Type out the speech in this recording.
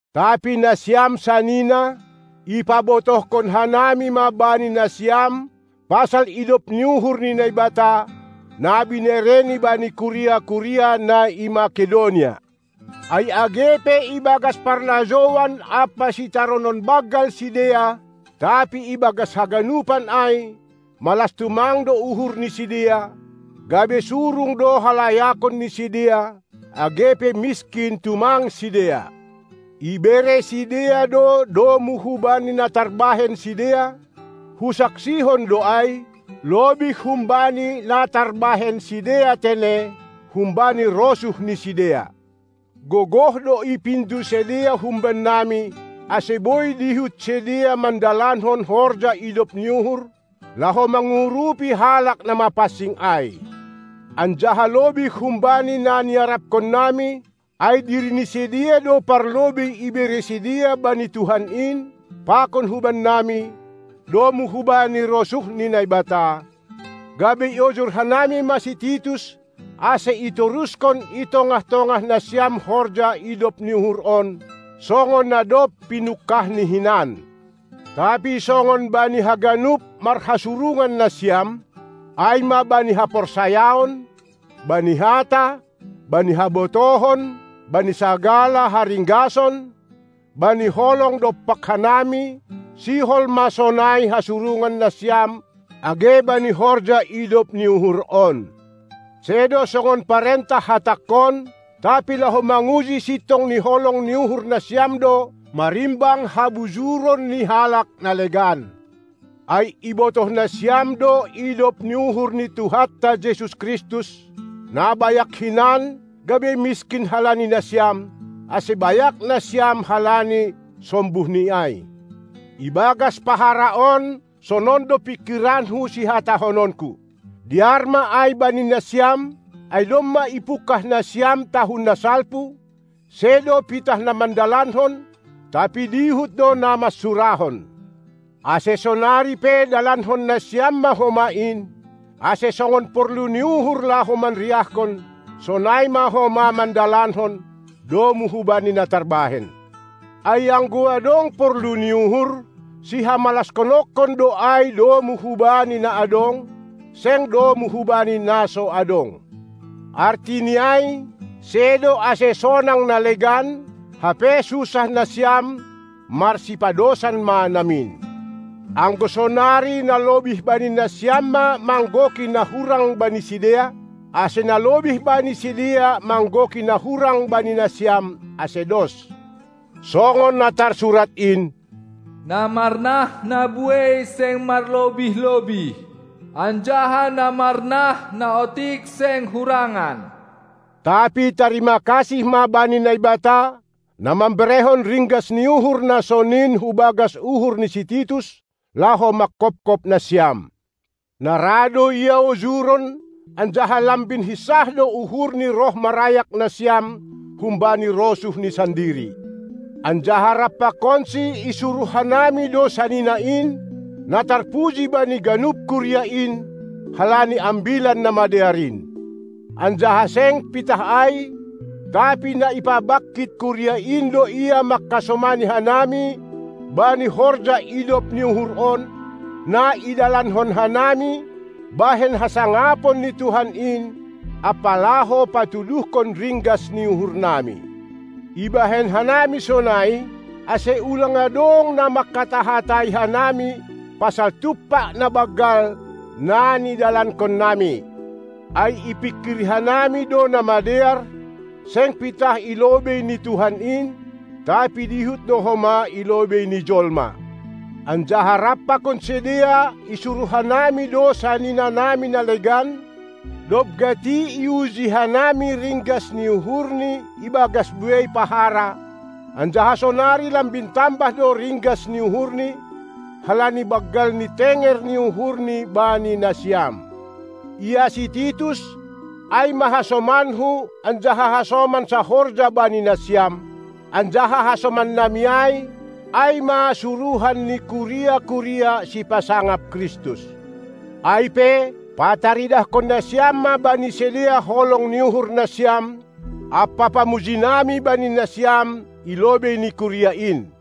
Tapi nasiam sanina, ipabotohkon hanami ma bani nasiam pasal idop ni uhur ni Naibata, na binereni bani kuria-kuria na i Makedonia. Ai age pe ibagas parlajouan ampa sitaronon banggal sidea, tapi ibagas haganupan ai malas tumang do uhur ni sidea, gabe surung do halayakon ni sidea, age pe miskin tumang sidea. Ibere sidea do domu hubani na tarbahen sidea, husaksihon do ai, lobih humbani na tarbahen sidea tene, humbani rosuh ni sidea. Gogoh do ipindo sidea humbannami, ase boi dihut sidea mandalankon horja idop ni uhur, laho mangurupi halak na mapansing ai. Anjaha lobih humbani na niarapkonnami, ai diri ni sidea do parlobei ibere sidea bani Tuhan in, pakon hubannami, domu hubani rosuh ni Naibata, gabe iojur hanami ma si Titus, ase itoruskon i i tongah-tongah nasiam horja idop ni uhur on, songon na dob pinungkahni hinan. Tapi songon bani haganup marhasurungan nasiam, ai ma bani haporsayaon, bani hata, bani habotohon, bani sagala haringgason, bani holong dompak hanami, sihol ma sonai hasurungan nasiam age bani horja idop ni uhur on. Sedo songon parentah hatangkon, tapi laho manguji sintong ni holong ni uhur nasiam do marimbang habujuron ni halak na legan. Ai ibotoh nasiam do idop ni uhur ni Tuhanta Jesus Kristus, na bayak hinan, gabe miskin halani nasiam, ase bayak nasiam halani sombuhNi ai. Ibagas pahara on sonon do pingkiranku sihatahononku: Dear ma ai bani nasiam, ai domma ipungkah nasiam tahun na salpu, sedo pitah na mandalankon, tapi dihut do na mansurahon. Ase sonari pe dalankon nasiam ma homa in, ase songon porlu ni uhur laho manriahkon, sonai ma homa mandalankon, domu hubani na tarbahen. Ai anggo adong porlu ni uhur, si hamalashononkon do ai domu hubani na adong, seng domu hubani na so adong. Artini ai sedo ase sonang na legan, hape susah nasiam; marsipadosan ma namin. Anggo sonari na lobih bani nasiam ma manggoki na hurang bani sidea, ase na lobih bani sidea manggoki na hurang bani nasiam, ase dos, songon na tarsurat in: Na marnah na buei seng marlobih-lobih, anjaha na marnah na otik seng hurangan. Tapi tarimakasih ma bani Naibata, na mamberehon ringgas ni uhur na sonin hubagas uhur ni si Titus, laho manghophop nasiam. Na ra do ia ojuron, anjaha lambin hinsah do uhurni roh marayak nasiam humbani rosuhni sandiri. Anjaha rap pakonsi isuruh hanami do sanina in, na tarpuji bani ganup kuria in, halani Ambilan Namadear in. Anjaha seng pitah ai, tapi na ipabangkit kuria in do ia mangkasomani hanami bani horja idop ni uhur on, na idalankon hanami bahen hasangapon ni Tuhan in ampa laho patuduhkon ringgas ni uhurnami. Ibahen hanami sonai, ase ulang adong na manghata-hatai hanami pasal tumpak na banggal, na nidalankonnami, ai ipingkiri hanami do na madear, seng pitah i lobei ni Tuhan in, tapi dihut do homa i lobei ni jolma. Anjaha rap pakon sidea isuruh hanami do saninanami na legan, dob gati i uji hanami ringgas ni uhurni ibagas buei pahara, anjaha sonari lambin tambah do ringgas ni uhurni, halani banggal ni tenger ni uhurni bani nasiam. Ia si Titus, ai ma hasomanku anjaha hasoman sahorja bani nasiam, anjaha hasomannami ai, ai ma suruhan ni kuria-kuria, sipasangap Kristus. Ai pe, pataridahkon nasiam ma bani sidea holong ni uhur nasiam ampa pamujinami bani nasiam, i lobei ni kuria in!